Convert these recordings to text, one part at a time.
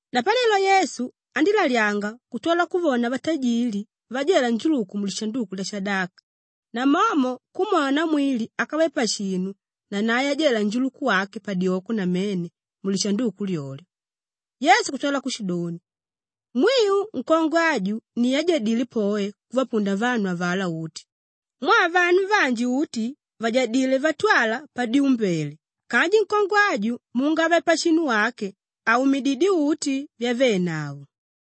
Napanelo Yesu andílalyanga kutwala kuvona vatajili vajela njuluku mulishanduku lyashadaka, namomo kumwona namwili ákave pashinu nanae ajela njuluku wake padyoko namene mulishanduku lyolyo. Yesu kutwala kushidoni, “Mwiu, nkongwe aju ni ájadile poe kuvapunda vanu avalá uti mwaa vanu vanji uti vajadilé vatwala padyumbele kanji nkongwe aju muungave-pashinu wake aumididyé uti vyavénavo.”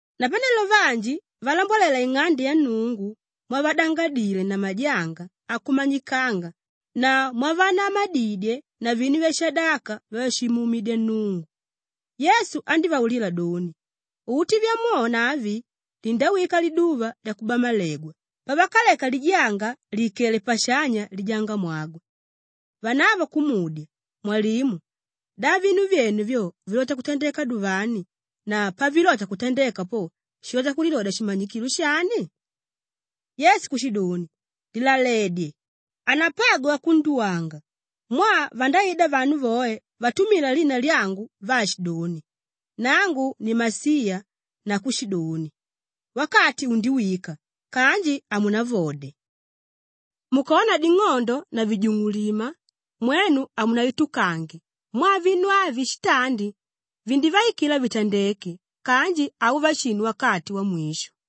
Napanelo vanji valambwalela ing'ande ya Nnungu mwavadangadile na majanga akumanyikanga na mwavanamadidye na vinu vyashadaka vyavashimuumidya Nnungu, Yesu andívaulila doni, “Uti vyamwona avi, lindawika liduva lyakubamalegwa pavakaleka lijanga lìikele pashanya lijangamwagwe.” Vanavo kumudya, “Mwalimu! Da vinu vyene vyo vilota kutandeka duvani na pavilota kutandeka po, shilota kulilodya shimanyikilo shani?” Yesu kushidoni, “Lilaledye! Hanapagwe wakunduwanga mwaa vandaida vanu voe vatumila lina lyangu vaashidoni, ‘Nangu ni Masiya’ na kushidoni, ‘Wakati undiwika’ kanji hamunavode. Mukona ding'ondo na vijungulima, mwenu hamunaitukange mwaa vinu avi shitandi vindivaikila vitandeke kanji hauva shinu wakati wamwisho.”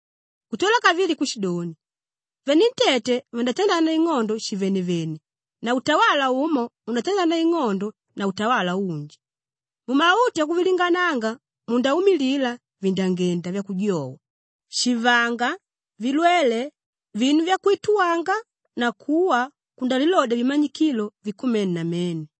Kutwala kavili kushidoni, “Venentete vandatandana ing'ondo shivenevene na utawala umo undatandana ing'ondo na utawala unji. Mumautu akuvilingananga mundaumilila vindangenda vyakujowa, shivanga, vilwele, vinu vyakwituwanga na kuwa kundalilodya vimanyikilo vikumene namene.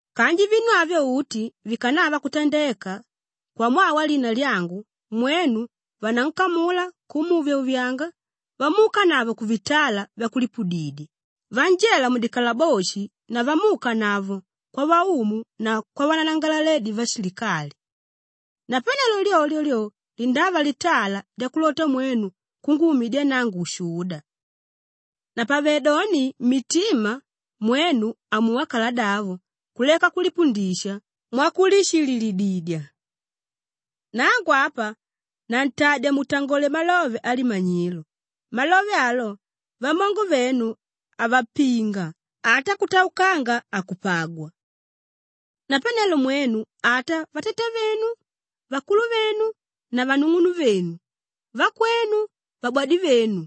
“Kanji vinu avyo uti vikanava kutandeka, kwamwaa walina lyangu mwenu vanankamula kumuuvyauvyanga, vamuukanavo kuvitala vyakulipudidya, vanjela mudikalaboshi na vamuukanavo kwavaumu na kwavananangalaledi vashilikali. Napanelo lyolyo lyo, lindava litala lyakulota mwenu kunguumidya nangu ushuda. Napavedoni mmitima mwenu amuwa kaladavo kuleka kulipundisha mwakulishililididya. Nangu apa nantadya mutangole malove alimanyilo; malove alo, vamongo venu havapinga ata kutaukanga hakupagwa. Napanelo mwenu ata vatatavenu, vakuluvenu na vanung'unuvenu, vakwenu, vabwadivenu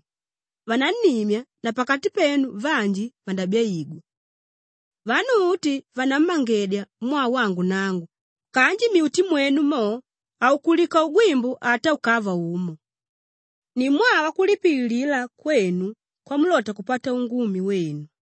vanannimya na pakati penu vanji vandabyaigwa. Vanu uti vanammangedya mwaa wangu nangu kanji mmyuti mwenu mo, haukulika ugwimbu ata ukava umo. Ni mwaa wakulipililila kwenu kwamulota kupata ungumi wenu.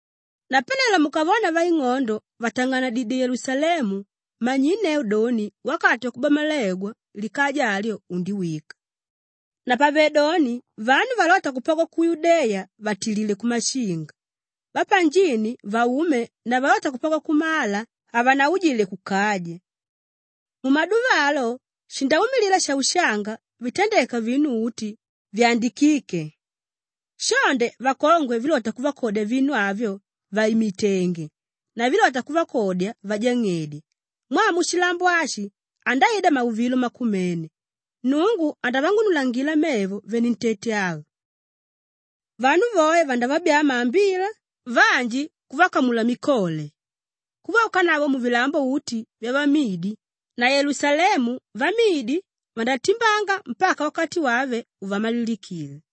“Napanelo mukavona vaing'ondo vàtang'anadidye Yelusalemu, manyinneu doni wakati wakubamalegwa likaja alyo undiwika. Napavedoni vanu valóta kupagwa ku Yudeya vatilile kumashinga, vapanjini vaume na valóta kupagwa kumala, havanaujile kukaja. Mumaduva alo shindaumilila shaushanga vitandeka vinu uti vyandikíke. Shonde vakongwe vílota kuvakodya vinu avyo vàimitenge na vílota kuvakodya vajang'edya mwaa mushilambo ashi andaida mauvilo makumene; Nnungu andavang'unulangila mevo venentete ava. Vanu voe vandavabyaa maambila, vanji kuvakamula mikole kuvaukanavo muvilambo uti vyavamidi na Yelusalemu vamidi vandatimbanga mpaka wakati wave uvamalilikile.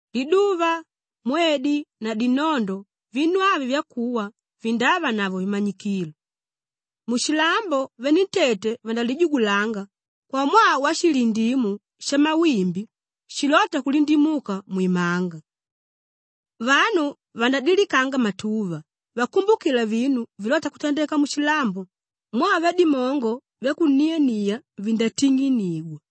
“Liduva, mwedi na dinondo vinu avi vyakuwa vindavanavo vimanyikilo; mushilambo venentete vandalijugulanga kwamwaa washilindimu shamawimbi shilóta kulindimuka mwimanga. Vanu vandadilikanga matuva vakumbukila vinu vilóta kutandeka mushilambo mwaa vyadimongo vyakuniania vindating'inigwa.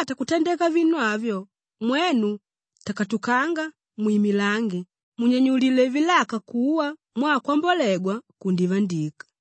Pavilota kutandeka vinu avyo, mwenu takatukanga mwimilange munyanyulile vilaka kuwa mwaa kwambolegwa kundivandika.”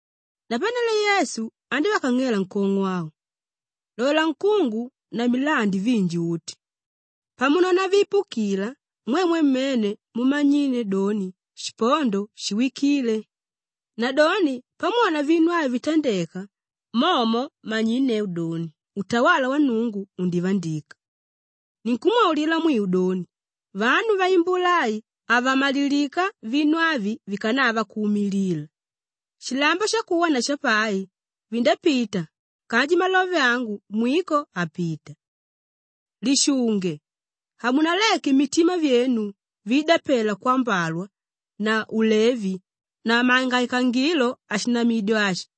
Napanelo Yesu andívakang'ela nkong'o au, “Lola nkungu na milandi vinji uti. Pamunona viipukila, mwemwe mmene mundamanyinneu doni shipondo shiwikile. Nadoni pamwona vinu avi vitandeka, momo manyinneu doni utawala wa Nnungu undivandika. Ninkumwaulila mwiu doni, vanu vaimbula ai havamalilika vinu avi vikanava kuumilila. Shilambo shakuwa na shapai, vindapita kanji malove angu mwiko hapita. “Lishunge! Hamunaleke mitima vyenu viidapelwa kwambalwa na ulevi na mangaikangilo ashinamidyo ashi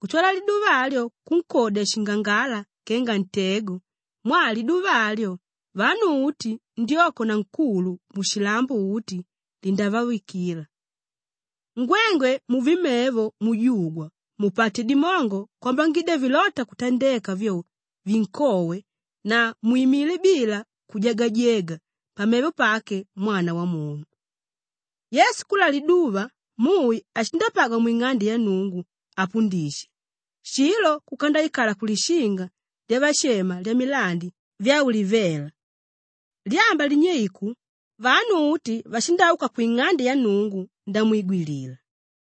kutwala liduva alyo kunkodya shingangala kenga ntego mwaa liduva alyo, vanu uti ndyoko na nkulu mushilambo uti, lindavawikila. Ngwengwe muve mevo mujugwa mupate dimongo kwambangidya vilóta kutandeka vyo vinkowe na mwimile bila kujagajega pamevo pake Mwana Wamunu.” Yesu kula liduva, mui ashindapagwa mwing'ande ya Nnungu apundisha, shilo kuka ndaikala kulishinga lyavashema Lyamilandi Vyaulivela. Lyamba linyeiku, vanu uti vashindauka kwing'ande ya Nnungu ndamwigwilila.